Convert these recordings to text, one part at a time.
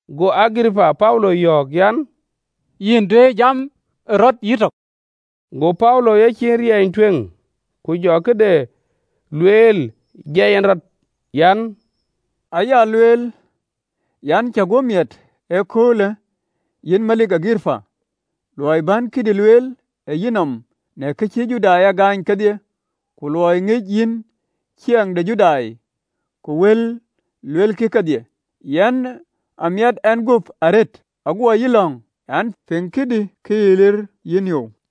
Go Agiripa Paulo yɔ̈ɔ̈k an, “Yïn duëër jam ë rɔt yïtök.” Go Paulo yecin riɛny tueŋ, ku jɔ këde lueel jiɛi en rɔt: “An, aya lueel an, cä guöp miɛt ee köölë, yïn melik Agiripa, luɔi bän këdï lueel, ë yïnɔm, në ka cï Judai a gaany kedhie, ku luɔi ŋic yïn ciɛɛŋ de Judai ku wël luelkï kedhie, yen a miɛt ɛn guöp arëët, aguɔ yï lɔ̈ŋ an, piŋ këdï ke yï liir yïpiɔ̈u piny.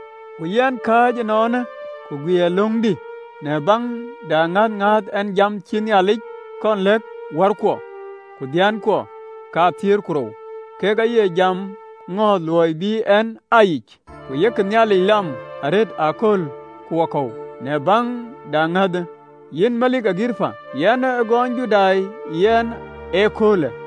Ku yɛn kääc ënɔɔnë, ku guiir löŋdï në baŋ de aŋäth ŋääth ɛn jam cïï Nhialic kɔn lɛ̈k wärkuɔ, ku dhiëënkuɔ kathiëër ku rou kek aye jamë ŋɔ̈ɔ̈th, luɔi bï en aa yic, ku yek Nhialic lam arëët aköl ku wakɔ̈u. Në baŋ de aŋäthë, yïn melik Agiripa, yen a gɔɔnyë Judai yɛn ee köölë.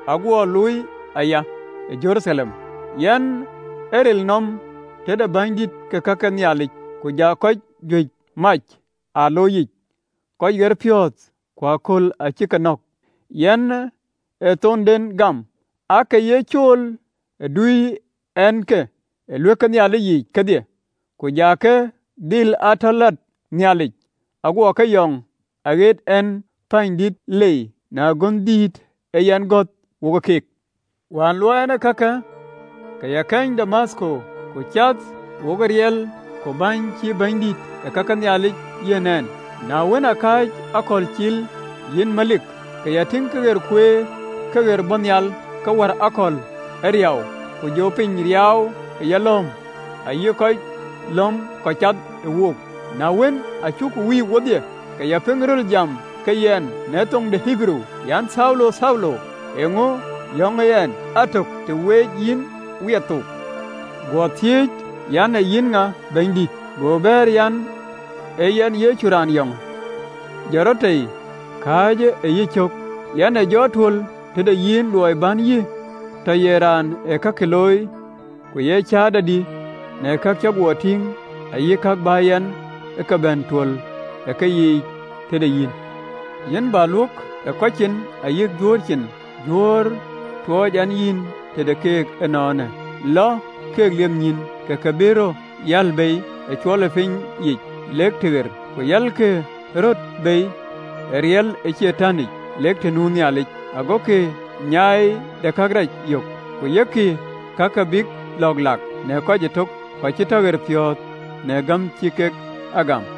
Aguɔ looi aya ë Jeruthalem. Yɛn ë riɛl nööm tëde bänydït ke ka ke Nhialic, ku ja kɔc juëc mac ë aloc yiic, kɔc ɣerpiɔ̈ɔ̈th, ku ëkööl cï ë ke nɔ̈k, yɛn ë thonden gam. Aake ya cool ë duöi ɛn ke ë ɣööt ke Nhialic yiic kedhie, ku ja ke dhil aa tɔ lat Nhialic, aguɔ ke yɔŋ ɣɛɛt pɛ̈ɛ̈nydït lei në agönhdïït aa yɛn gɔ̈th wo keek. “Wään luɔɔi ɛn ee kake, ke ya keny Damathko, ku cath wo riɛl ku bɛ̈ɛ̈ny cïï bänydït ke ka ke Nhialic yiɛ̈n ɛn, na wën, akääc akɔ̈l cil, yïn melik, ke ya tïŋ këɣer kueer, këɣeer bɔ̈ nhial, ke wär akɔ̈l ë riau, ku jɔ piny riaau ë yalɔ̈ɔ̈m, ayï kɔc lɔ̈m kɔc ciɛth wok. Na wën, aa cuk wïïk wedhie, ke ya piŋ röl jam ke yɛn në thoŋ ë Ɣeberuu an, ‘Thaulo, Thaulo! Eeŋö yɔŋ yïn ɛn? Atök të wec yïn wiɛth thook.’ Guɔ thiëëc an, ‘Ee yïn ŋa, Bɛ̈nydït?’ Go bɛ̈ɛ̈r an, ‘Ee Yɛn Yecu, raan yɔŋë. Jɔt rɔt tei, kääcë ë yïcök. Yɛn ë jɔ tuöl tëde yïn, luɔi bän yï tɔ ye raan ë kakï looi ku ye cäätɔdï në ka cï guɔ tïŋ, ayï ka bä yɛn ke bɛ tuöl ë keyiic tëde yïn. Yïn bä luök ë kɔc cin, ayï Juöör cin, Juöör tuɔɔc yɛn yïn tëde keek ënɔɔnë. Lɔ keek liep nyïïn, ke ke bï röt yäl bei ë mɔ̈ɔ̈thic lek tëɣer, ku yɛlkï röt bei ë riɛl ë Catanic, lek të nu Nhialic, agokï nyiɛɛi de karɛc yök, ku yökkï kë bïk lɔ̈ɔ̈k lak në kɔc ëtök kɔc cï tɔ piɛthpiɔ̈ɔ̈th në gäm cï kek a gam.’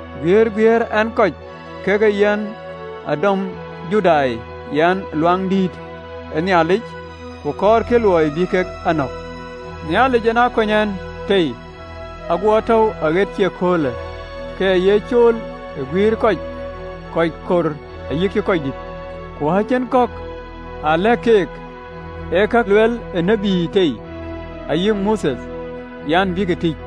Guiëër guiëër ɛn kɔc kakë, yen aa dɔmë Judai yɛn ë Luaŋdïtic, ku kɔɔrkï luɔi bï kek a nɔ̈k. Nhialic yen aa kony a tei, aguɔ tɔ̈u aɣët cï ee köölë, ke ya ye cool ë guïïr kɔc, kɔc kor ayï röördït, ku acïn kɔ̈k aa lɛ̈k keek, ee kak ë lueel tït tei, ayï Mothe an, bïk tïc: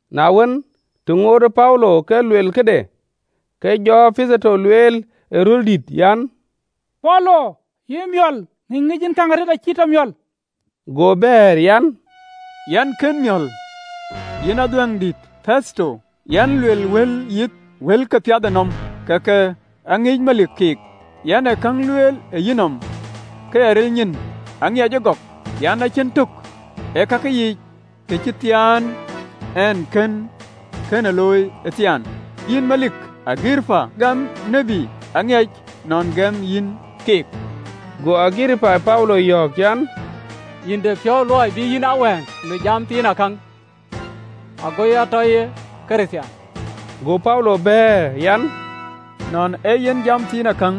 Na wën, të ŋootë Paulo ke luel këde, ke jɔ Petheto lueel ë röl dït an, “Paulo, yïn ë miɔ̈l, ŋïny ŋic yïn käŋ arëët acï yï tɔ miɔ̈l!” Go bɛ̈ɛ̈r an, “Yɛn kën miɔ̈l, yïn adhuɛ̈ŋ dït Petheto, yɛn luel wël yith wël ke piathënɔm. Kakë aŋic melik keek, yɛn ë käŋ lueel ë yenɔm ke ya ril nyin: aŋiɛc ëgɔk an, cïn tök ë kakë yiic kë cï thiën en, kënë akënë looi athiaan. Yïn, melik Agiripa, gam tït? Aŋiɛc nɔn gɛm yïn keek!” Go Agiripa Paulo yɔ̈ɔ̈k an, “Yïn de piɔ̈u luɔi bï yïn a wëŋ në jam thiinakäŋ, ago ya tɔ ye Kërthiaan.” Go Paulo bɛ̈ɛ̈r an, “Nɔn ee yen jam thiinakäŋ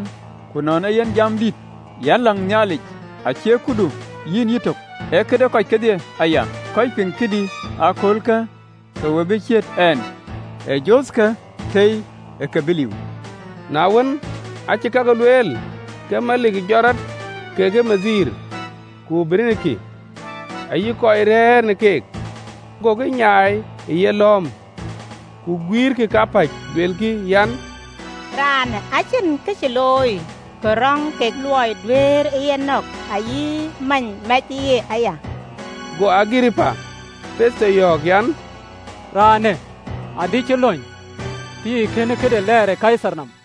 ku nɔn ee yen jam dït, yɛn läŋ Nhialic, acie këdu yïn yïtök, ee këde kɔc kedhie aya, kɔc piŋ këdï ee köölë, ke we bï ciët ɛn, ee jothkë tei, ee kek bï liu.” Na wën, aacï kakë lueel, ke melik jɔt rɔt kekë bɛ̈ny, ku Berenike, ayï kɔc rɛ̈ɛ̈r në keek, gokï nyaai ë yelɔ̈ɔ̈m, ku guiirkï kapäc, luelkï an, “Raanë acïn kë cï looi kë röŋ ke luɔi duëërë ye nɔ̈k, ayï many mɛcë yen aya.” Go Agiripa Petheto yɔ̈ɔ̈k an, “Raanë adï cï lony, tëë kën këde lɛɛr ë Kaithar nɔm.”